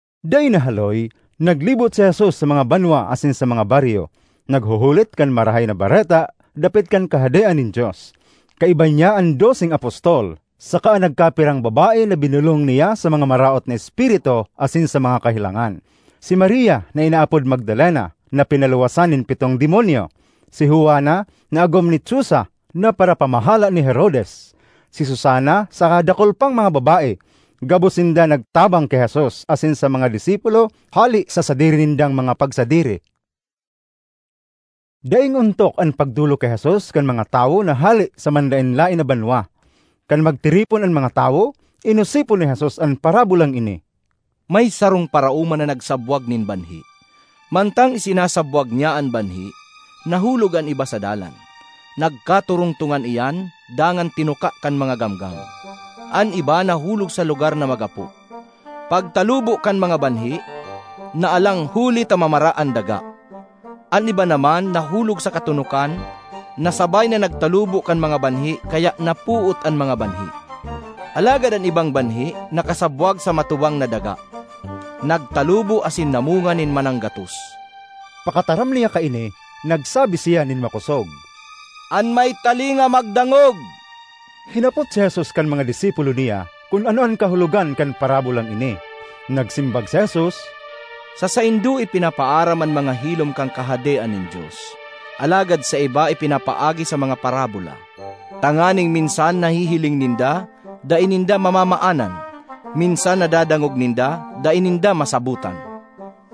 Dai nahaloy, naglibot si Jesus sa mga banwa asin sa mga baryo, naghuhulit kan Marahay na Bareta dapit kan Kahadean nin Dios. Kaiba niya an doseng apostol, saka an nagkapirang babae na binolong niya sa mga maraot na espiritu asin sa mga kahelangan: si Maria na inaapod Magdalena na pinaluwasan nin pitong demonyo; si Juana na agom ni Chuza na parapamahala ni Herodes; si Susana saka dakul pang mga babae. Gabos sinda nagtabang ki Jesus asin sa mga disipulo hale sa sadiri nindang mga pagsadiri. Daing ontok an pagdolok ki Jesus kan mga tawo na hale sa manlaen-laen na banwa. Kan magtiripon an mga tawo, inosipon ni Jesus an parabolang ini: ”May sarong paraoma na nagsabwag nin banhi. Mantang isinasabwag niya an banhi, nahulog an iba sa dalan; nagkatorongtongan iyan, dangan tinuka kan mga gamgam. An iba nahulog sa lugar na magapo; pagtalubo kan mga banhi, naalang huli ta mamara an daga. An iba naman nahulog sa katonokan na sabay na nagtalubo kan mga banhi kaya napoot an mga banhi. Alagad an ibang banhi nakasabwag sa matubang na daga; nagtalubo asin namunga nin mananggatos.” Pakataram niya kaini, nagsabi siya nin makosog, “An may talinga, magdangog!” Hinapot si Jesus kan mga disipulo niya kun ano an kahulogan kan parabolang ini. Nagsimbag si Jesus, “Sa saindo ipinapaaram an mga hilom kan Kahadean nin Dios, alagad sa iba ipinapaagi sa mga parabola, tanganing minsan nahihiling ninda dai ninda mamaanan; minsan nadadangog ninda dai ninda masabotan.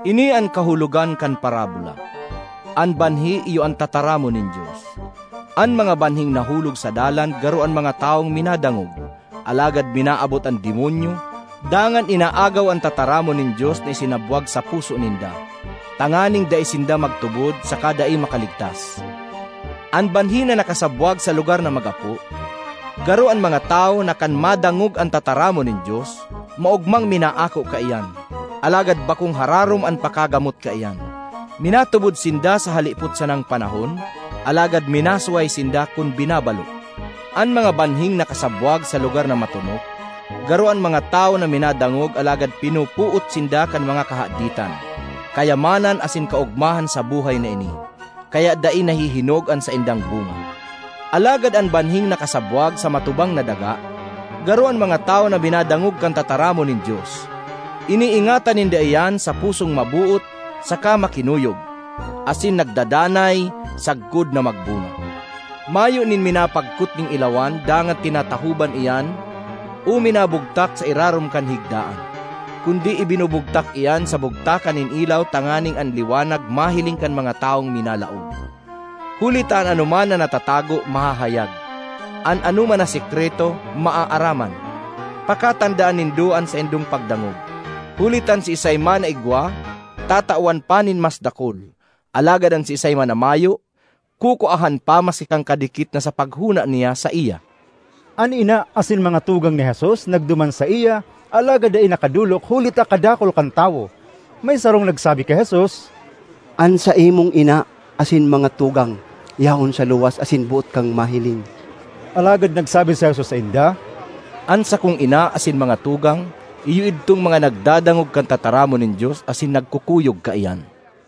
”Ini an kahulogan kan parabola: an banhi iyo an tataramon nin Dios. An mga banhing nahulog sa dalan garo an mga tawong minadangog, alagad minaabot an Demonyo dangan inaagaw an tataramon nin Dios na isinabwag sa puso ninda tanganing dai sinda magtubod saka dai makaligtas. An banhi na nakasabwag sa lugar na magapo garo an mga tawo na kan madangog an tataramon nin Dios, maogmang minaako kaiyan. Alagad bakong hararom an pakagamot kaiyan; minatubod sinda sa halipot sanang panahon, alagad minasuhay sinda kun binabalo. An mga banhing nakasabwag sa lugar na matonok garo an mga tawo na minadangog, alagad pinopoot sinda kan mga kahaditan, kayamanan asin kaogmahan sa buhay na ini kaya dai nahihinog an saindang bunga. Alagad an banhing nakasabwag sa matubang na daga, garo an mga tawo na minadangog kan tataramon nin Dios. Iniingatan ninda iyan sa pusong maboot saka makinuyog, asin nagdadanay sagkod na magbunga. ”Mayo nin minapagkot nin ilawan dangan tinatahoban iyan o nubugtak (minabugtak) sa irarom kan higdaan; kundi ibinubugtak iyan sa bugtakan nin ilaw tanganing an liwanag mahiling kan mga tawong minalaog. ”Huli ta an anoman na natatago, mahahayag; an anoman na sekreto, maaaraman. ”Pakatandaan nindo an saindong pagdangog, huli ta an siisay man na igwa, tatawan pa nin mas dakul; alagad an siisay man na mayo, kukuahan pa maski kan kadikit na sa paghona niya saiya.” An ina asin mga tugang ni Jesus nagduman saiya alagad dai nakadolok huli ta kadakul kan tawo. May sarong nagsabi ki Jesus, “An saimong ina asin mga tugang yaon sa luwas asin boot kang mahiling.” Alagad nagsabi si Jesus sainda, “An sakong ina asin mga tugang iyo idtong mga nagdadangog kan tataramon nin Dios asin nagkukuyog kaiyan.”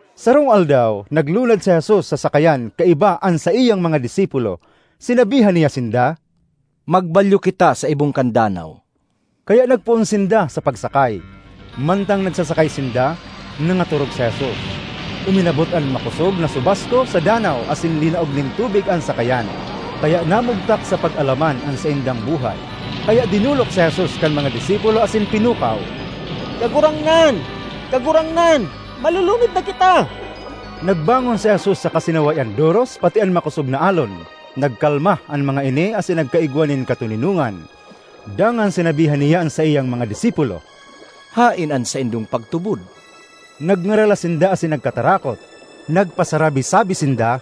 Sarong aldaw naglunad si Jesus sa sakayan kaiba an saiyang mga disipulo. Sinabihan niya sinda, “Magbalyo kita sa ibong kan danaw.” Kaya nagpoon sinda sa pagsakay. Mantang nagsasakay sinda, nangatorog si Jesus. Uminabot an makosog na subasko sa danaw asin linaog nin tubig an sakayan, kaya namugtak sa pag-alaman an saindang buhay. Kaya dinolok si Jesus kan mga disipulo asin pinukaw, “Kagurangnan! Kagurangnan! Malulunod na kita!” Nagbangon si Jesus saka sinaway an doros pati an makosog na alon; nagkalma an mga ini asin nagkaigwa nin katoninongan. Dangan sinabihan niya an saiyang mga disipulo, “Haen an saindong pagtubod?” Nagngaralas sinda asin nagkatarakot; nagpasarabi-sabi sinda,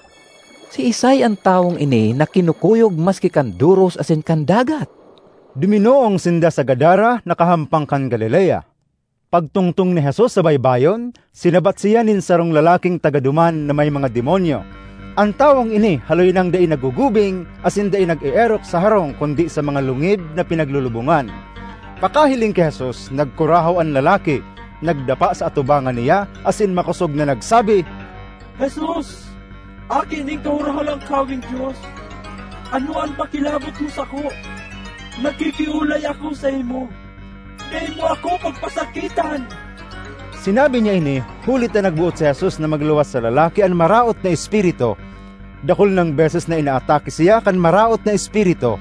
“Siisay an tawong ini na kinukuyog maski kan doros asin kan dagat?” Duminoong sinda sa Gadara na kahampang kan Galilea. Pagtungtong ni Jesus sa baybayon, sinabat siya nin sarong lalaking taga duman na may mga demonyo. An tawong ini haloy nang dai naggugubing asin dai nag-eerok sa harong kundi sa mga lungib na pinaglulubongan. Pakahiling ki Jesus, nagkurahaw an lalaki, nagdapa sa atubangan niya asin makosog na nagsabi, “Jesus, Aki nin Kahorohalangkaweng Dios, ano an pakilabot mo sako? Nakikiolay ako saimo, dai mo ako pagpasakitan!” Sinabi niya ini huli ta nagboot si Jesus na magluwas sa lalaki an maraot na espiritu. Dakul nang beses na inaatake siya kan maraot na espiritu;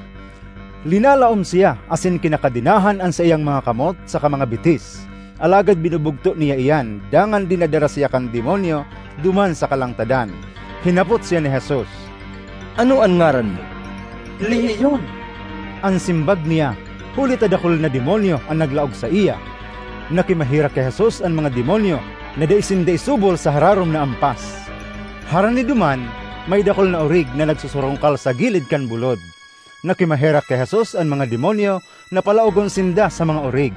linalaom siya asin kinakadenahan an saiyang mga kamot saka mga bitis, alagad binubugto niya iyan dangan dinadara siya kan demonyo duman sa kalangtadan. Hinapot siya ni Jesus, “Ano an ngaran mo?” “Lehiyon,” an simbag niya—huli ta dakul na demonyo an naglaog saiya. Nakimaherak ki Jesus an mga demonyo na dai sinda isubol sa hararom na ampas. Harani duman, may dakul na orig na nagsusurungkal sa gilid kan bulod. Nakimaherak ki Jesus an mga demonyo na palaogon sinda sa mga orig;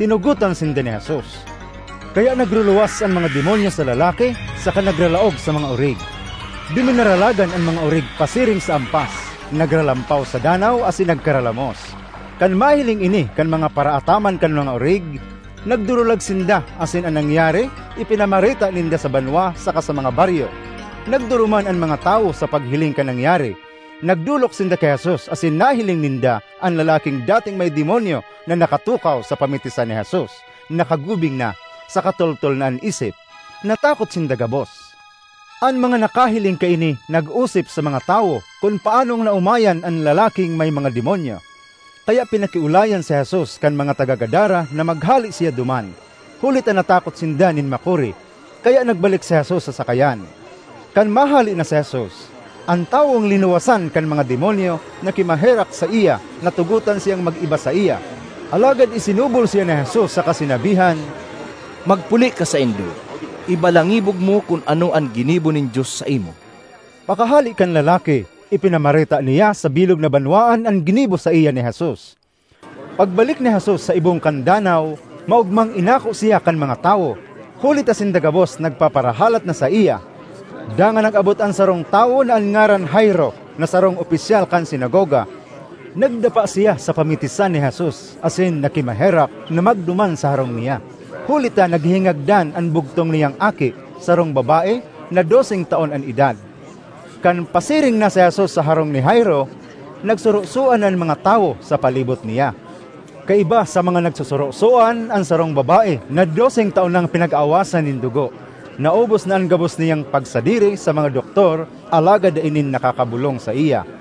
tinugotan sinda ni Jesus. Kaya nagruluwas an mga demonyo sa lalaki saka nagralaog sa mga orig. Duminaralagan an mga orig pasiring sa ampas, nagralampaw sa danaw asin nagkaralamos. Kan mahiling ini kan mga paraataman kan mga orig, nagdurulag sinda asin an nangyari ipinamareta ninda sa banwa saka sa mga baryo. Nagduruman an mga tawo sa paghiling kan nangyari. Nagdolok sinda ki Jesus asin nahiling ninda an lalaking dating may demonyo na nakatukaw sa pamitisan ni Jesus, nakagubing na, saka toltol na an isip. Natakot sinda gabos. An mga nakahiling kaini nag-osip sa mga tawo kun paanong naomayan an lalaking may mga demonyo. Kaya pinakiolayan si Jesus kan mga taga Gadara na maghale siya duman, huli ta natakot sinda nin makuri; kaya nagbalik si Jesus sa sakayan. Kan mahale na si Jesus, an tawong linuwasan kan mga demonyo nakimaherak saiya na tugotan siyang mag-iba saiya. Alagad isinubol siya ni Jesus saka sinabihan, ”Magpuli ka saindo; ibalangibog mo kun ano an ginibo nin Dios saimo.” Pakahale kan lalaki, ipinamareta niya sa bilog na banwaan an ginibo saiya ni Jesus. Pagbalik ni Jesus sa ibong kan danaw, maogmang inako siya kan mga tawo, huli ta sinda gabos nagpaparahalat na saiya. Dangan nag-abot an sarong tawo na an ngaran Jairo na sarong opisyal kan sinagoga. Nagdapa siya sa pamitisan ni Jesus asin nakimaherak na magduman sa harong niya, huli ta naghihingagdan an bugtong niyang aki, sarong babae na doseng taon an edad. Kan pasiring na si Jesus sa harong ni Jairo, nagsurusoan an mga tawo sa palibot niya. Kaiba sa mga nagsusurosoan an sarong babae na doseng taon nang pinag-aawasan nin dugo. (Naubos na an gabos niyang pagsadiri sa mga doktor alagad dai nin nakakabolong saiya.)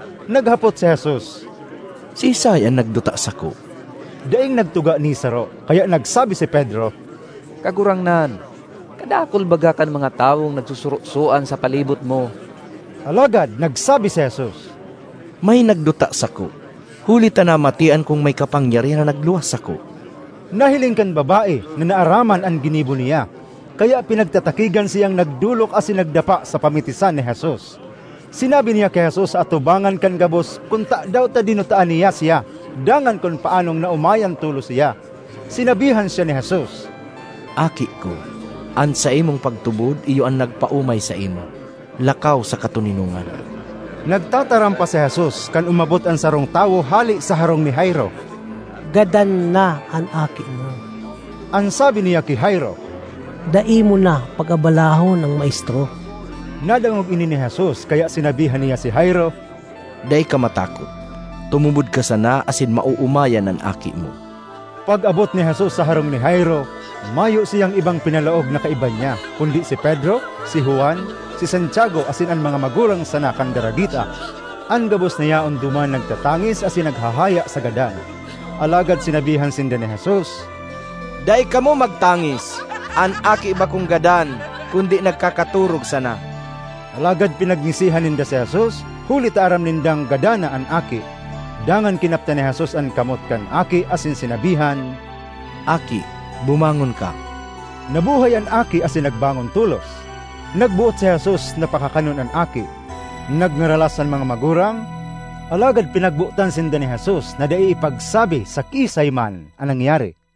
Naghapot si Jesus, “Siisay an nagduta sako?” Daing nagtuga ni saro, kaya nagsabi si Pedro, “Kagurangnan, kadakul baga kan mga tawong nagsusurosoan sa palibot mo.” Alagad nagsabi si Jesus, “May nagduta sako, huli ta namatean kong may kapangyarihan na nagluwas sako.” Nahiling kan babae na naaraman an ginibo niya, kaya pinagtatakigan siyang nagdolok asin nagdapa sa pamitisan ni Jesus. Sinabi niya ki Jesus sa atubangan kan gabos kun tadaw ta dinutaan niya siya dangan kun paanong naomayan tolos siya. Sinabihan siya ni Jesus, “Aki ko, an saimong pagtubod iyo an nagpaomay saimo. Lakaw sa katoninongan.” Nagtataram pa si Jesus kan umabot an sarong tawo hale sa harong ni Jairo. “Gadan na an aki mo,” an sabi niya ki Jairo, “dai mo na pag-abalahon an maestro.” Nadangog ini ni Jesus kaya sinabihan niya si Jairo, “Dai ka matakot, tumubod ka sana asin maoomayan an aki mo.” Pag-abot ni Jesus sa harong ni Jairo, mayo siyang ibang pinalaog na kaiba niya kundi si Pedro, si Juan, si Santiago asin an mga magurang sana kan daragita. An gabos na yaon duman nagtatangis asin naghahaya sa gadan. Alagad sinabihan sinda ni Jesus, “Dai kamo magtangis! An aki bakong gadan kundi nagkakatorog sana!” Alagad pinagngisihan ninda si Jesus huli ta aram nindang gadan na an aki. Dangan kinaptan ni Jesus an kamot kan aki asin sinabihan, “Aki, bumangon ka!” Nabuhay an aki asin nagbangon tolos; nagboot si Jesus na pakakanon an aki. Nagngaralas an mga magurang, alagad pinagbotan sinda ni Jesus na dai ipagsabi sa kiisay man an nangyari.